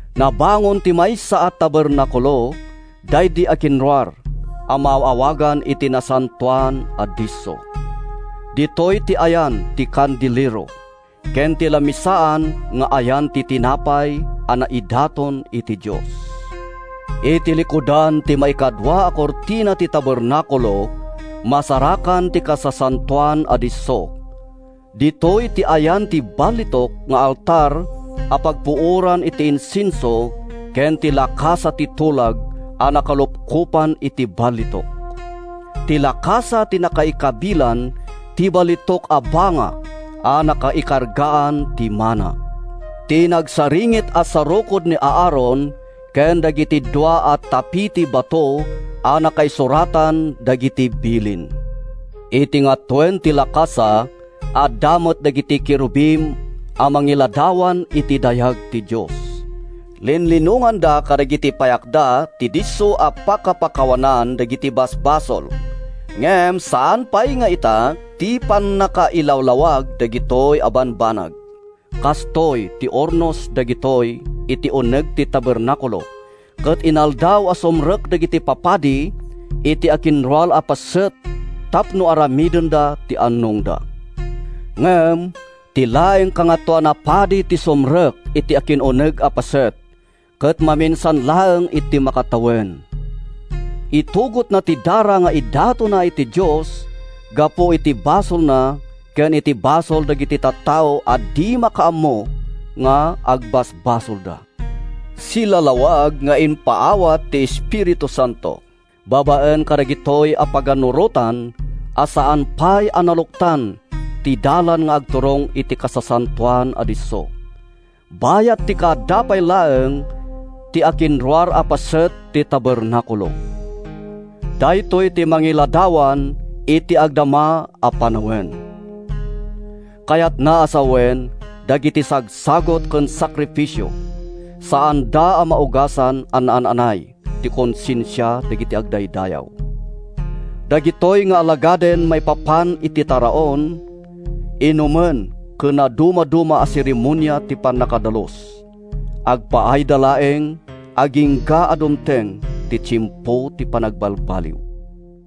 Nabangon ti maysa a tabernakulo, daydi akinruar, a maaw-awagan iti Nasantoan a Disso. Ditoy ti ayan ti kandelero, ken ti lamisaan nga ayan ti tinapay a naidaton iti Dios. Iti likudan ti maikadua a kurtina ti tabernakulo, masarakan ti Kasasantoan a Disso. Ditoy ti ayan ti balitok nga altar a pagpuoran iti insenso ken ti lakasa ti tulag a nakalupkopan iti balitok. Ti lakasa ti nakaikabilan ti balitok a banga a nakaikargaan ti mana, ti nagsaringit a sarukod ni Aaron ken dagiti dua a tapi ti bato a nakaisuratan dagiti bilin. Iti ngatoen ti lakasa, adda met dagiti kerubim a mangiladawan iti dayag ti Dios. Linlinonganda kadagiti payakda ti disso a pakapakawanan dagiti basbasol. Ngem saan pay nga ita ti pannakailawlawag dagitoy a bambanag. Kastoy ti urnos dagitoy iti uneg ti tabernakulo ket inaldaw a sumrek dagiti papadi iti akinruar a paset ti tapno aramidenda ti annongda. Ngem ti laeng Kangatoan a Padi ti sumrek iti akin-uneg a paset, ket maminsan laeng iti makatawen. Itugotna ti dara nga idatonna iti Dios gapu iti basolna ken iti basol dagiti tattao a di makaammo nga agbasbasolda. Silalawag nga impaawat ti Espiritu Santo babaen kadagitoy a pagannurotan a saan pay a naluktan ti dalan nga agturong iti Kasasantoan a Disso, bayat ti kaadda pay laeng ti akinruar a paset ti tabernakulo. Daytoy ti mangiladawan iti agdama a panawen. Kayatna a sawen a dagiti sagsagut ken sakrifisio, saanda a maugasan a naan-anay ti konsensia dagiti agdaydayaw. Dagitoy nga alagaden maipapan iti taraon, inumen ken nadumaduma a seremonia ti pannakadalus, agpaayda laeng agingga a dumteng ti tiempo ti panagbalbaliw.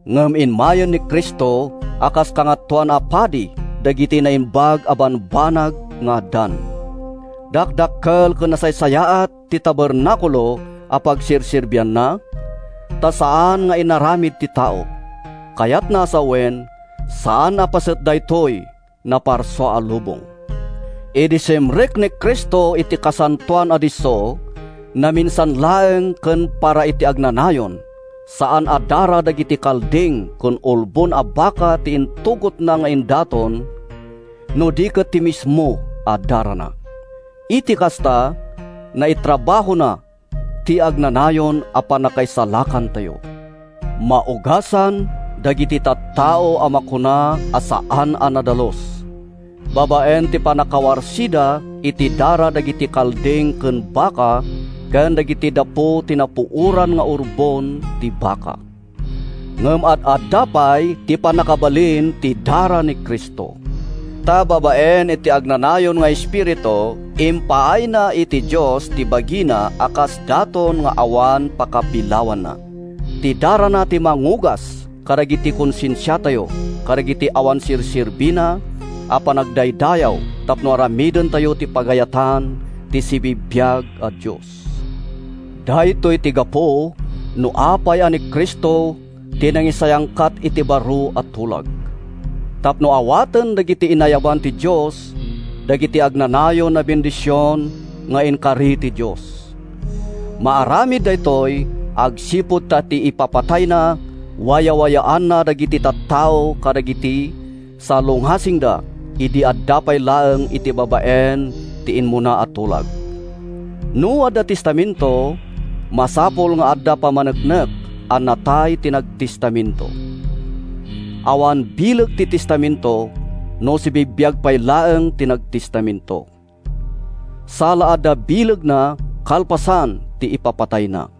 Ngem immayen ni Cristo a kas Kangatoan a Padi dagiti naimbag a bambanag nga addan. Dakdakkel ken nasaysayaat ti tabernakulo a pagserserbianna, ta saan nga inaramid ti tao, kayatna a sawen, saan a paset daytoy naparsua a lubong. Idi simrek ni Cristo iti Kasantoan a Disso—naminsan laeng ken para iti agnanayon—saan a dara dagiti kalding ken urbon a baka ti intugotna nga idaton, no di ket ti mismo a darana. Iti kasta, naitrabahona ti agnanayon a pannakaisalakantayo. Maugasan dagiti tattao a makuna a “saan a nadalus,” babaen iti pannakawarsida iti dara dagiti kalding ken baka ken dagiti dapu ti napuoran nga urbon ti baka. Ngem ad-adda pay ti pannakabalin ti dara ni Cristo! Ta babaen iti agnanayon nga Espiritu, impaayna iti Dios ti bagina a kas daton nga awan pakapilawanna. Ti darana ti mangugas kadagiti konsensiatayo kadagiti awan serserbina a panagdaydayaw tapno aramidentayo ti pagayatan ti sibibiag a Dios. Daytoy ti gapu no apay a ni Cristo ti mangisayangkat iti baro a tulag: tapno awaten dagiti inayaban ti Dios dagiti agnanayon a bendision nga inkari ti Dios. Maaramid daytoy agsipud ta iti ipapatayna, wayawayaanna dagiti tattao kadagiti salungasingda idi adda pay laeng iti babaen ti immuna a tulag. No adda testamento, masapul nga adda pammaneknek a natay ti nagtestamento. Awan bileg ti testamento no sibibiag pay laeng ti nagtestamento. Sa la adda bilegna kalpasan ti ipapatayna.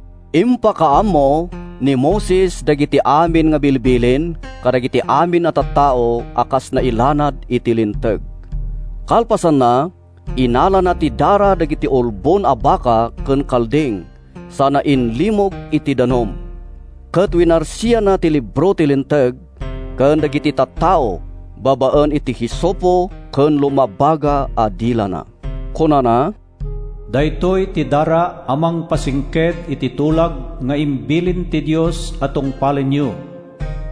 Impakaammo ni Moises dagiti amin a bilbilin kadagiti amin a tattao kas nailanad iti Linteg. Kalpasanna, innalana ti dara dagiti urbon a baka ken kalding sana inlimog iti danum, ket winarsianna ti libro ti Linteg ken dagiti tattao babaen iti hisopo ken lumabaga a de lana. Kunana, “Daytoy ti dara a mangpasingked iti tulag nga imbilin ti Dios a tungpalenyo.”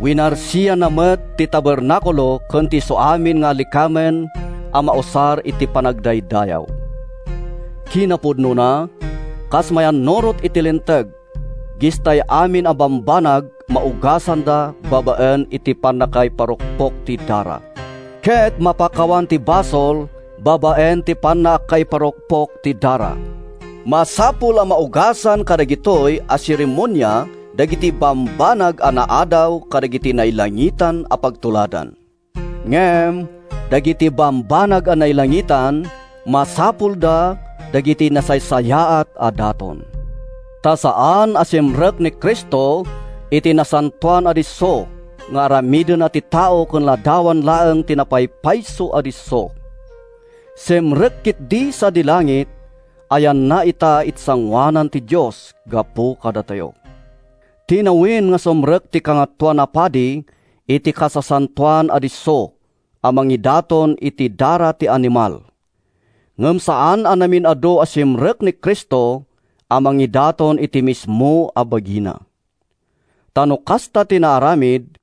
Winarsianna met ti tabernakulo ken ti isuamin nga alikamen a mausar iti panagdaydayaw. Kinapudnona, kas mayannurot iti Linteg, gistay amin a bambanag maugasanda babaen iti pannakaiparukpok ti dara, ket mapakawan ti basol babaen iti pannakaiparukpok ti dara. Masapul a maugasan kadagitoy a seremonia dagiti bambanag a naadaw kadagiti nailangitan a pagtuladan. Ngem dagiti bambanag a nailangitan, masapulda dagiti nasaysayaat a daton. Ta saan a simrek ni Cristo iti Nasantoan a Disso nga aramid ti tao ken ladawan laeng ti napaypayso a disso. Simrek ketdi sadi langit a yanna ita iti sangoanan ti Dios gapu kadatayo. Tinawen a sumrek ti Kangatoan a Padi iti Kasasantoan a Disso a mangidaton iti dara ti animal. Ngem saan a namin-adu a simrek ni Cristo a mangidaton iti mismo a bagina. Ta no kasta ti naaramid,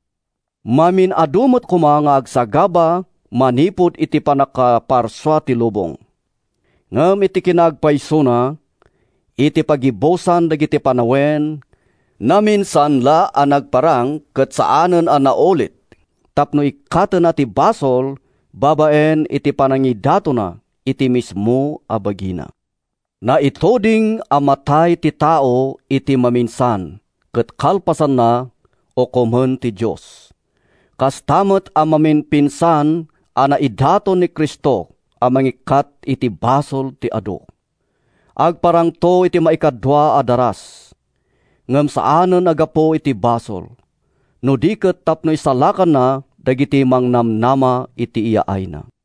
mamin-adu met koma nga agsagaba manipud iti pannakaparsua ti lubong. Ngem iti kinaagpaysona, iti paggibusan dagiti panawen, naminsan la a nagparang ket saanen a naulit, tapno ikkatenna ti basol babaen iti panangidatonna iti mismo a bagina. Naituding a matay ti tao iti maminsan, ket kalpasanna, ukomen ti Dios. Kasta met a namimpinsan a naidaton ni Cristo a mangikkat iti basol ti adu. Agparangto iti maikadua a daras, ngem saanen a gapu iti basol, no di ket tapno isalakanna dagiti mangnamnama iti yaayna.